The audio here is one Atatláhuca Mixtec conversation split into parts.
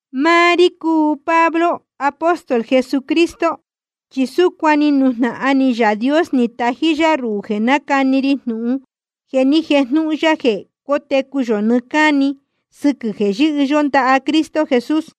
Máá rí cúu Pablo, apóstol Jesucristo, chi súcuan ni nujnahan ni Yaā Dios ni tají yá ruhū jeē nácani ri jnūhun jeē ni jéjnūhun ya jeē cótecu yō nɨɨ́ cáni sɨquɨ̄ jeē yɨ́hɨ yó ndaha Cristo Jesús.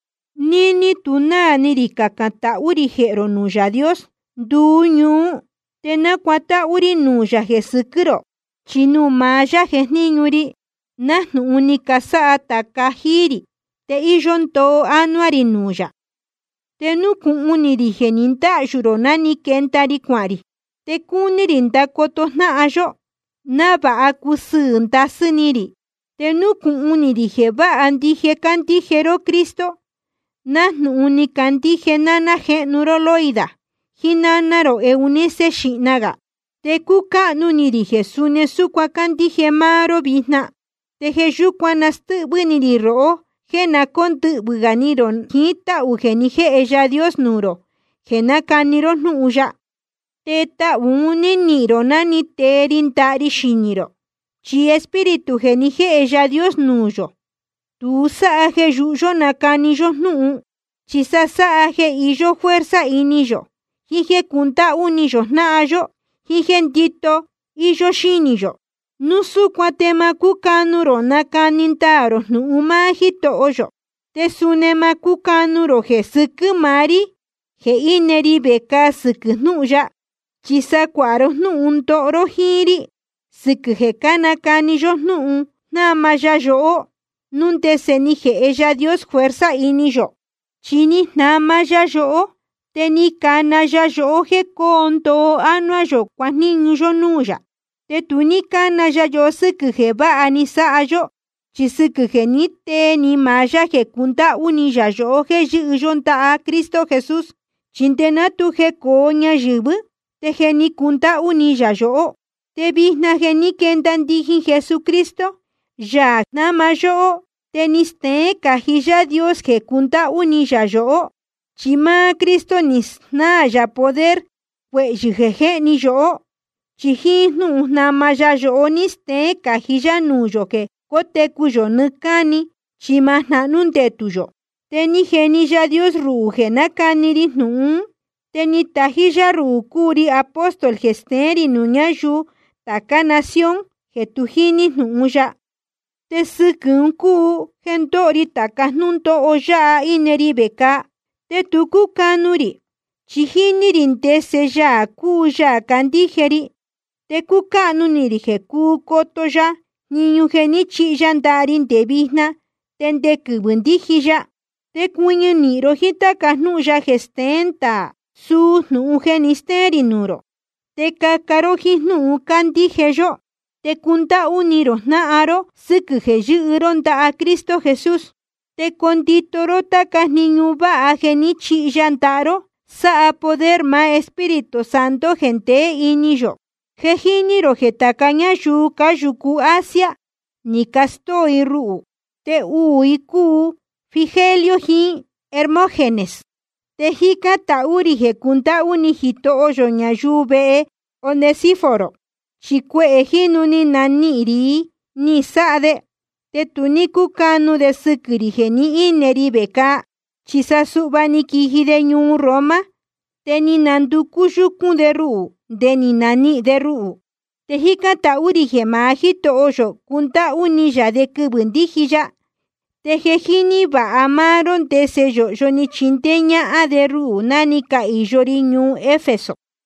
Níní tu náā ni rī cacān tahú rī jehē rō nuū Yaā Dios nduú ñuú, te nácuatáhú rí nuū yā jeē sɨquɨ́ rō. Chi nuū maá yá jejníñu ri, nájnūhun ni casáha tāca jíí rī, te íyó ndoo ánuá rī nuū yā. Te núcūhun ni rī jeē ni ndáhyū rō ná ni quenda ri cuahān rī. Te cúu ni rī ndacoto jnáhan yó, návāha cusɨɨ̄ ndasɨ́ ni rī. Te núcūhun ni rī jeē váha ndije cándíje ró Cristo, nájnūhun ni candíje náná jéhnu ró Loida, jíín náná rō Eunice xīhna gā. Te cúcáhnu ni rī jeē suni súcuan cándíje máá ró vijna. Te jeē yúcuan nástɨ́hvɨ́ ni rī rohó jéē na cóndɨhvɨ̄ gā ni rō jiín táhū jeē ni jéhe Yaā Dios nuū rō jeē nácani ró jnúhun ya. Te tahū un ní nihīn rō ná ni tee ri ndaha ri xinī rō. Chi Espíritu jeē ni jéhe Yaā Dios nuū yō, tu sáha jeē yūhu yó nacani yó jnúhun, chi sa sáha jeē iyó fuerza ini yō, jiín jéē cundáhú ni yō jnáhan yó, jiín jéē ndíto íyó xínī yō. Núu súcuan te ma cúcanu rō nacani ndaā rō jnūhun máá Jítoho yō. Te suni ma cúcanu rō jeē sɨquɨ́ maá rí jeē íne ri vecāa sɨquɨ̄ jnúhun ya. Chi sa cuāha ró jnúhun ndoho ró jíín rí sɨquɨ̄ jeē cánacani yó jnúhun jnáma ya yohó, núu ndese ni jēhe Yaā Dios fuerza ini yō. Chi ni jnama ya yohó, te ni cana ya yohó jéē coo ndoo ánuá yō cuajníñu yó núū yā. Te tu ní cána ya yohó sɨ́quɨ̄ jeē váha ni sáha yó, chi sɨquɨ̄ jeē ní tee ni maá yá jeē cundáhú ni yā yohó jéē yɨ́hɨ yó ndaha Cristo Jesús. Chi nde ná tu jecōo ñayɨ̄vɨ́, te je cúndáhú ni yā yohó. Te vijna jeē ní quenda ndijin Jesucristo, Yaā jnáma yóhó, te ni steén cají Yaā Dios jeē cundáhú ni yā yohó. Chi máá Cristo ni snáā yā poder cuehyɨ̄ jéhni yóhó, chi jíín jnúhun jnáma ya yohó ni steén cají yá nuū yō jeē cótecu yō nɨɨ́ cáni chi ma jnahnú ndetū yō. Te ni jeni Yaā Dios ruhū jeē nácani ri jnūhun ún, te ni tají yá ruhū cúu ri apóstol jeē steén rī nuū ñáyuu tācá nación jeē tu jíní jnūhun ya. Te sɨquɨ̄ un cúu jeē ndóho ri tāca jnúndóho yáha íne ri vecāa. Te tu cúcanu rī, chi jíní rī ndese Yaā cúu Yaā candíje ri, te cúcáhnu ni rī jeē cúu coto ya jniñu jeē ní chihi ya ndaha ri nde vijna te nde quɨvɨ̄ ndíji ya. Te cuɨñɨ nīhin ró jíín táca jnúhun ya jeē steén ndaā, suu jnūhun jeē ni stéén rī nuū rō. Te caca ró jíín jnúhun cándíje yó, te cundáhú ni rō jnáhan ró sɨquɨ̄ jeē yɨ́hɨ ró ndaha Cristo Jesús. Te condito ró táca jniñu váha jeē ní chihi ya ndaha ró, sáha poder maá Espíritu Santo jeē ndeé ini yō. Je jíní rō jeē tāca ñáyuu cáyūcu Asia ni castóo i ruhū. Te uū i cúu Figelo jiín Hermógenes. Te jícán tahú rī jeē cundáhú ni Jitoho yō ñayuu vehe Onesíforo, chi cuehē jínu ni nanihīn ni rī ni sáha de, te tu ní cúcanu de sɨquɨ̄ rī jeē ní ine ri vecāa. Chi sa suhva ná ni quiji de ñuu Roma, te ni nanducú yúcún de ruhū nde ni nanihīn de ruhū. Te jícán tahú rī jeē maá Jítoho yō cundáhú ni yā de quɨvɨ̄ ndíji ya. Te je jíní vāha máá ró ndese yōhyo ni chindéé ñáhán de ruhū ná ni cahīyo ri ñuu Efeso.